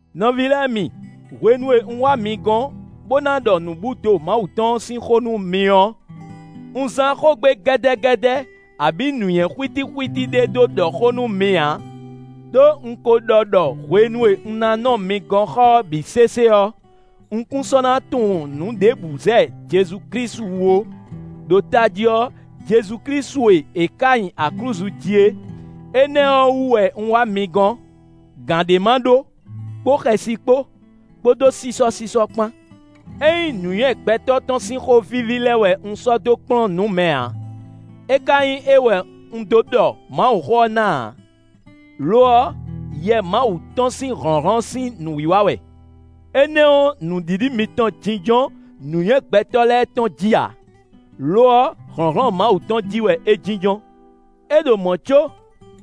Nɔví lɛ́ɛ mi, hwenu e un wá mi gɔ́n bó ná ɖɔ nǔbúdo Mawu tɔn ɔ́ sín xó nú mi ɔ́, un zán xógbe gɛ́dɛ́gɛ́dɛ́, abǐ nǔnywɛ́ xwítíxwítí ɖé dó ɖɔ xó nú mi ǎ. Đó un ko ɖɔ ɖɔ hwenu e un ná nɔ mi gɔ́n xɔ ɔ́ bǐ sésé ɔ́, un kún sɔ́ ná tunwun nǔ ɖěbǔ zɛ Jezu Klísu wú ó; ɖo tají ɔ́, Jezu Klísu e è ká nyi aklúzu jí é. Énɛ́ ɔ́ wú wɛ un wá mi gɔ́n, gǎn ɖé ma ɖó, kpó xɛsi kpó, kpódó sísɔ́sísɔ́ kpán. É nyí nǔnywɛ́ gbɛtɔ́ tɔn sín xó víví lɛ́ɛ wɛ un sɔ́ dó kplɔ́n nǔ mɛ ǎ, é ka nyí é wɛ un dó ɖɔ Mawuxó ɔ́ ná ǎ; lo ɔ́, Yɛ Mawu tɔn sín hlɔ̌nhlɔ́n sín nǔwiwa wɛ. Énɛ́ ɔ́, nǔɖiɖi mitɔn jínjɔ́n nǔnywɛ́ gbɛtɔ́ lɛ́ɛ tɔn jí ǎ; lo ɔ́ hlɔ̌nhlɔ́n Mawu tɔn jí wɛ é jínjɔ́n. É ɖo mɔ̌ có,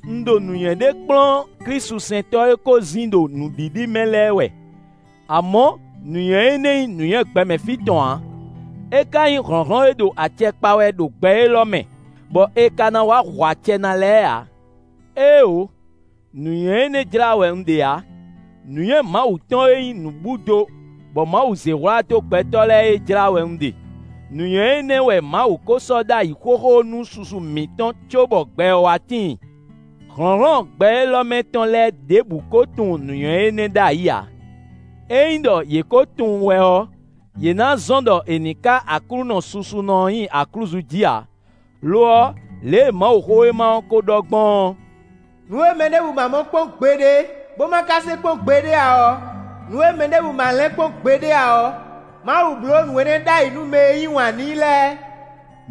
un ɖo nǔnywɛ́ ɖé kplɔ́n klísusɛntɔ́ e ko zin ɖo nǔɖiɖi mɛ lɛ́ɛ wɛ; amɔ̌ nǔnywɛ́ énɛ́ nyí nǔnywɛ́ gbɛmɛ fí tɔn ǎ; é ka nyí hlɔ̌nhlɔ́n e ɖo acɛ kpa wɛ ɖo gbɛ élɔ́ mɛ, bɔ è ka ná wá hu acɛ ná lɛ́ɛ ǎ. Éeǒ! Nǔnywɛ́ énɛ́ jlá wɛ un ɖe ǎ. Nǔnywɛ́ Mawu tɔn e nyí nǔbúdo bɔ Mawu zé hwlá dó gbɛtɔ́ lɛ́ɛ é jlá wɛ un ɖe; nǔnywɛ́ énɛ́ wɛ Mawu ko sɔ́ ɖ'ayǐ xóxó nú susu mǐtɔn, cóbɔ gbɛ ɔ́ wá tíin. Hlɔ̌nhlɔ́n gbɛ élɔ́ mɛ tɔn lɛ́ɛ ɖěbǔ kó tunwun nǔnywɛ́ énɛ́ ɖ'ayǐ ǎ; ényí ɖɔ yě kó tunwun wɛ ɔ́, yě ná zɔ́n ɖɔ è nǐ ká Aklúnɔ susunɔ ɔ́ nyi aklúzu jí ǎ. Lo ɔ́, lě e Mawuxówéma ɔ́ kó ɖɔ gbɔn ɔ́: “Nǔ e mɛ ɖěbǔ ma mɔ kpɔ́n gbeɖé, bó ma ka se kpɔ́n gbeɖé ǎ ɔ́, nǔ e mɛ ɖěbǔ ma lin kpɔ́n gbeɖé ǎ ɔ́, Mawu bló nǔ énɛ́ ɖ'ayǐ nú mɛ e yí wǎn n'i lɛ́ɛ.”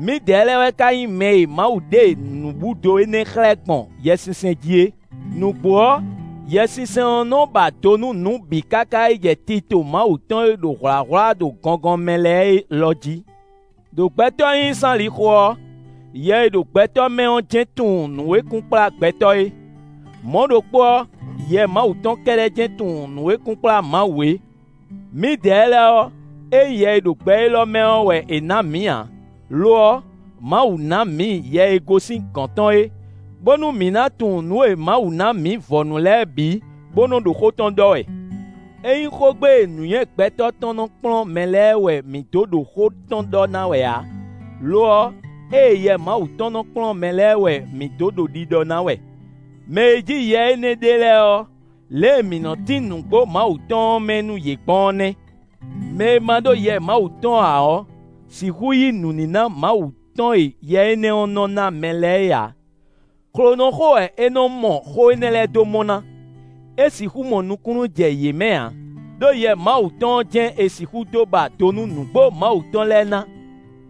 Mǐdɛɛ lɛ́ɛ wɛ ka nyí mɛ e Mawu ɖe nǔbúdo énɛ́ xlɛ́ gbɔn Yɛsinsɛn jí é. Nǔgbó ɔ́, Yɛsinsɛn ɔ́ nɔ ba do nú nǔ bǐ káká jɛ tito Mawu tɔn e ɖo hwlǎhwlá ɖo gɔngɔn mɛ lɛ́ɛ é lɔ jí. Đo gbɛtɔ́ nyínyí sín alixo ɔ́, yɛ e ɖo gbɛtɔ́ mɛ ɔ́ jɛ́n tunwun nǔ e kunkplá gbɛtɔ́ é; mɔ̌ ɖokpó ɔ́, Yɛ Mawu tɔn kɛ́ɖɛ́ jɛ́n tunwun nǔ e kunkplá Mawu é. Mǐdɛɛ lɛ́ɛ ɔ́, ényí yɛ e ɖo gbɛ élɔ́ mɛ ɔ́ wɛ è nǎ mǐ ǎ; lo ɔ́, Mawu ná mǐ Yɛ e gosín gɔ̌n tɔn é, bónú mǐ ná tunwun nǔ e Mawu ná mǐ vɔ̌nu lɛ́ɛ bǐ, bó nɔ́ ɖo xó tɔn ɖɔ wɛ. É nyí xógbe e nǔnywɛ́ gbɛtɔ́ tɔn nɔ kplɔ́n mɛ lɛ́ɛ wɛ mǐ dó ɖo xó tɔn ɖɔ ná wɛ ǎ; lo ɔ́, ée Yɛ Mawu tɔn nɔ kplɔ́n mɛ lɛ́ɛ wɛ mǐ dó ɖo ɖiɖɔ ná wɛ. Mɛ e jí Yɛ énɛ́ ɖe lɛ́ɛ ɔ́, lě e mǐ nɔ tín nǔgbó Mawu tɔn ɔ́ mɛ nú yě gbɔn ɔ́ nɛ́. Mɛ e ma ɖó Yɛ Mawu tɔn ǎ ɔ́ sixú yí nǔníná Mawu tɔn e Yɛ énɛ́ ɔ́ nɔ ná mɛ lɛ́ɛ é ǎ; xlonɔxó wɛ é nɔ́ mɔ xó énɛ́ lɛ́ɛ dó mɔ ná; é sixú mɔ nukúnnú jɛ yě mɛ ǎ, ɖó Yɛ Mawu tɔn ɔ́ jɛ́n è sixú dó ba do nú nǔgbó Mawu tɔn lɛ́ɛ ná.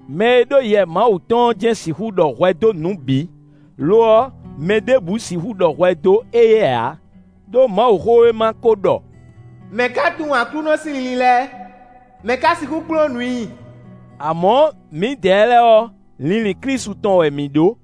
Mɛ e ɖó Yɛ Mawu tɔn ɔ́ jɛ́n sixú ɖɔ hwɛ dó nǔ bǐ; lo ɔ́, mɛ ɖěbǔ sixú ɖɔ hwɛ dó éyɛ́ ǎ. Ɖó Mawuxówéma ko ɖɔ: “Mɛ̌ ka tunwun Aklúnɔ sín linlin lɛ́ɛ? Mɛ̌ ka sixú kplɔ́n nǔ i?” Amɔ̌, mǐdɛɛ lɛ́ɛ ɔ́, linlin Klísu tɔn wɛ mǐ ɖó.